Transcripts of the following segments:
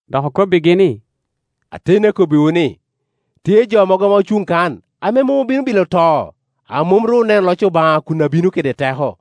Dok okobbigi ni, “Ateni akobbiwu ni, tye jo mogo ame ocuŋ kan, ame mom bino bilo to, a mom ru oneno loc Obaŋa kun abino kede teko.”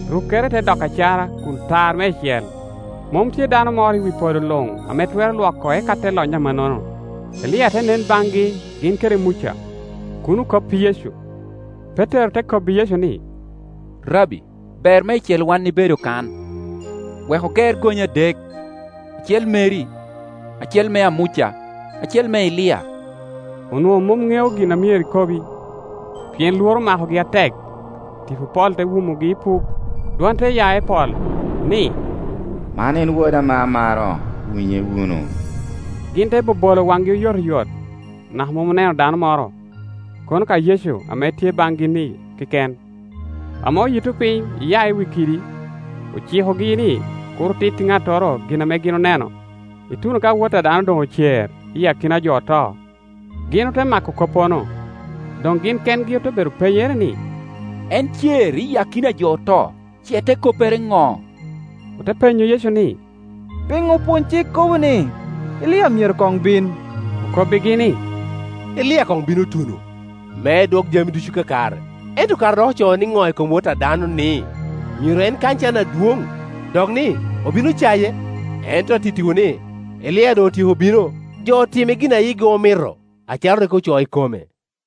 rukkere te doko acara kun tar meicel; mom tye dano moro i wi podo luŋ ame twero lwoko eka te lony amannono. Elia te nen baŋgi gin kede Muca, kun okop i Yecu. Petero te kobbi Yecu ni, “Rabbi, ber meicel wan ibedo kan; wek oger gonye adek, acel meri, acel mea Muca, acel me Elia.” Onwoŋo mom ŋeo gin a myero ekobi, pien lworo omako-gi atek. Tipo pol te wumogi ipuk, dwon te ya i pol, ni, “Man en Woda ame amaro; winye wunu.” Gin te bobolo waŋgi oyotoyot, naka mom oneno dano moro, kono ka Yecu ame tye baŋgi-ni keken. Ame oyitto piny iya i wi kidi, ocikogi ni kur otit i ŋattoro gin ame gin oneno, ituno ka Wot a dano doŋ ocer i akina a jo oto. Gin ote mako koppono, doŋ gin kengi ote bedo penyere ni, “En cer i akina a jo oto ce te koppere no?” Ote penyo Yecu ni, “Piŋo opwony-cik kobo ni, Elia myero koŋ bin?” Okobbigi ni, “Elia koŋ bino tuno, me edwok jami ducu kakare. Ento kara dok ocoo nino i kom Wot a dano ni, myero en kany can adwoŋ, dok ni, obino caye? Ento an atittiwu ni, Elia doŋ otyeko bino, jo otime gin a yigi omito, acalo rik ocoo i kome.”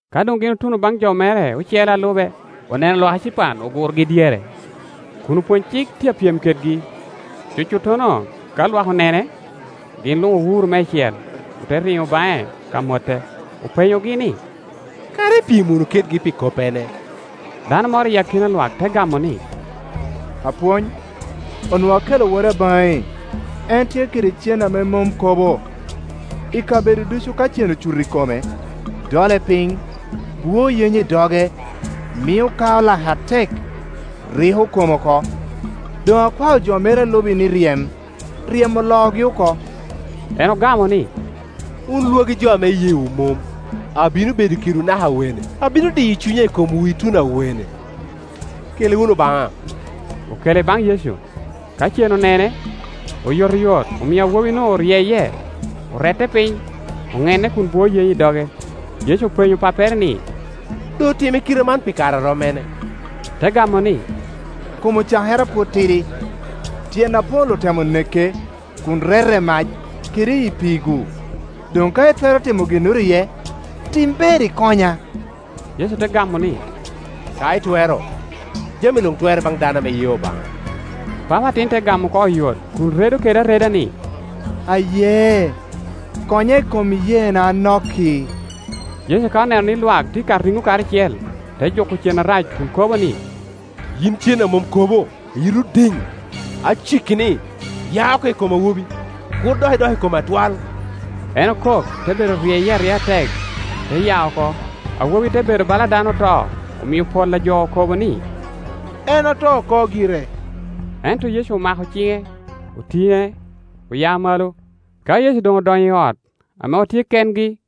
Ka doŋ gin otuno baŋ jo mere ocele a lube, oneno lwak ecipan ogurogi dyere, kun opwony-cik tye a pyem kedgi. Cucuttono ka lwak onene, gin luŋ owuro meicel, ote riŋo baŋe ka mote. Openyogi ni, “Kara ipyem wunu kedgi pi koppene?” Dano moro i akina lwak te gamo ni, “Apwony, onwoŋo akelo woda baŋi. En tye kede cen a mom kobo; i kabedo ducu ka cen ocuto i kome, dole piny, bwoo yenyo i doge, mio kao lake atek, riko kome oko. Doŋ akwao jo meri a lubi ni ryem, ryemo oloogi oko.” En ogamo ni, “Wun lwagi jo ame iyeewu mom, abino bedo kedwu naka awene? Abino diyo cunya i komwu ituno awene? Kele wunu baŋa.” Okele baŋ Yecu. Ka cen onene, oyotoyot omio awobi-nu oryeye; orette piny, onenne kun bwoo yenyo i doge. Yecu openyo pappere ni, “Doŋ otime kite man pi kare a rom mene?” Te gamo ni, “Kom cakere a pwod tidi. Tyen apol otemo neke kun rete i mac kede i pii-gu. Doŋ ka itwero timo ginnoro iye, tim ber ikonya.” Yecu te gamo ni, “Ka itwero! Jami luŋ twerre baŋ dano ame ye Obaŋa.” Papa atin te gamo oko oyot kun redo kede areda ni, “Aye; konya i kom iyeena anok-ki.” Yecu ka oneno ni lwak tye ka riŋo karacel, te juko cen arac kun kobo ni, “Yin cen a mom kobo, ame yiti odiŋ, aciki ni, ya oko i kom awobi, kur dok idok i kome atwal.” En okok, te bedo ryeye aryea atek, te ya oko; awobi te bedo bala dano oto, omio pol a jo okobo ni, “En oto oko gire.” Ento Yecu omako ciŋe, otiŋe, oya malo. Ka Yecu doŋ odonyo i ot, ame otye kengi,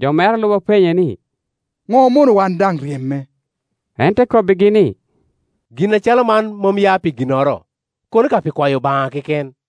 jo mere a lube openye ni, “Ŋo omono wan daŋ iryeme?” En te kobbigi ni, “Gin acalo man mom ya pi ginnoro, kono ka pi kwayo Obaŋa keken.”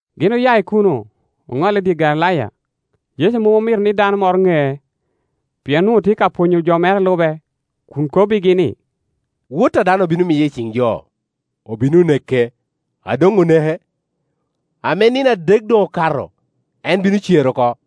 Gin oya i kuno, oŋolle i dye Galilaya. Yecu mom omito ni dano moro ŋee: pien onwoŋo tye ka pwonyo jo mere a lube, kun kobbigi ni, “Wot a dano obino miye i ciŋ jo, obino neke; a doŋ oneke, ame nino adek doŋ okato, en bino cer oko.”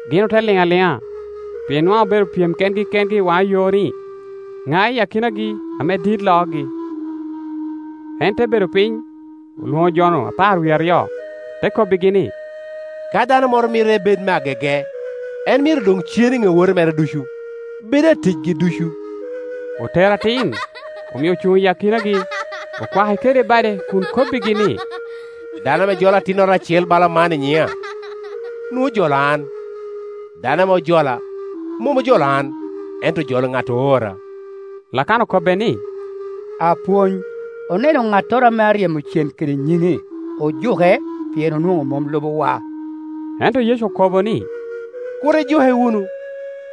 Gin ote liŋ aliŋa, pien nwaŋ obedo pyem kengi kengi i waŋa yo ni, ŋa i akinagi ame dit loogi? En te bedo piny, olwoŋo jo-nu apar wie aryo, te kobbigi ni, “Ka dano moro mito ebed me agege, en myero doŋ cen i ŋe owote mere ducu, bed aticgi ducu.” Otero atin, omio ocuŋ i akinagi, okwake kede bade kun kobbigi ni, “Dano ame jolo atinnoro acel bala man i nyiŋa, nwoŋo ojolo an; dano ame jola, mom ojolo an, ento ojolo ŋat oora.” Lakana okobbe ni, “Apwony, oneno ŋattoro ame aryemo cen kede nyiŋi, ojuke, pien onwoŋo mom lubowa.” Ento Yecu okobo ni, “Kur, ijuke wunu;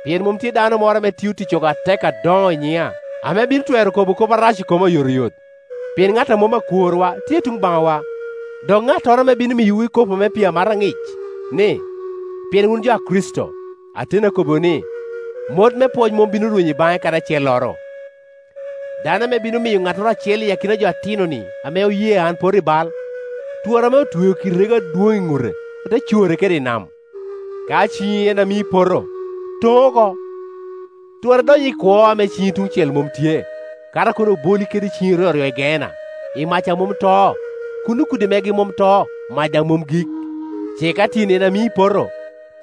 pien mom tye dano moro ame tio ticcogo atek adoŋo i nyiŋa, ame bino twero kobo kop arac i koma oyotoyot. Pien ŋat a mom akworwa tye tuŋ baŋwa. Dok ŋattoro ame bino miyowu ikopo me pii amata aŋic, ni, pien wun jo a Kricito, ateni akobbiwu ni, mot me pwoc mom bino rwenyo i baŋe kadi acelloro. “Dano ame bino miyo ŋattoro acel i akina jo-ni atino-ni ame oye an opoto i bal, twara ame otweo kidi rego adwoŋ i ŋute, ote core kede nam. Ka ciŋi en a mii ipoto, toŋ oko; twara idony i kwo ame ciŋi tuŋ cel mom tye, kato a kono oboli kede ciŋi ryoryo i Geena, i mac a mom to, [ Kuno kudi megi mom to, mac daŋ mom gik.] Ce ka tyeni en a mii ipoto,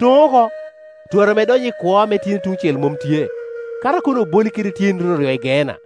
toŋ oko; twara ame idony i kwo ame tyeni tuŋ cel mom tye, kato a kono oboli kede tyeni ryoryo i Geena. [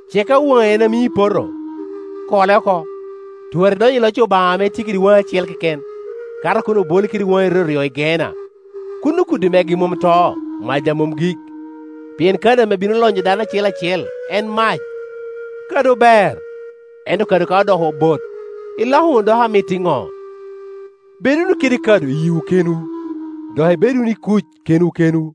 Ce ka waŋi en a mii ipoto, kole oko; twara idony i loc Obaŋa ame itye kede waŋi acel keken, kato a kono oboli kede waŋi ryoryo i Geena. Kuno kudi megi mom to, mac daŋ mom gik. “Pien kado ame bino lonyo dano acel acel en mac. Kado ber; ento kado ka odoko bot, iloko wunu doko amit iŋo? Bed wunu kede kado i yiwu kenwu, dok ibed wunu i kuc kenwu kenwu.”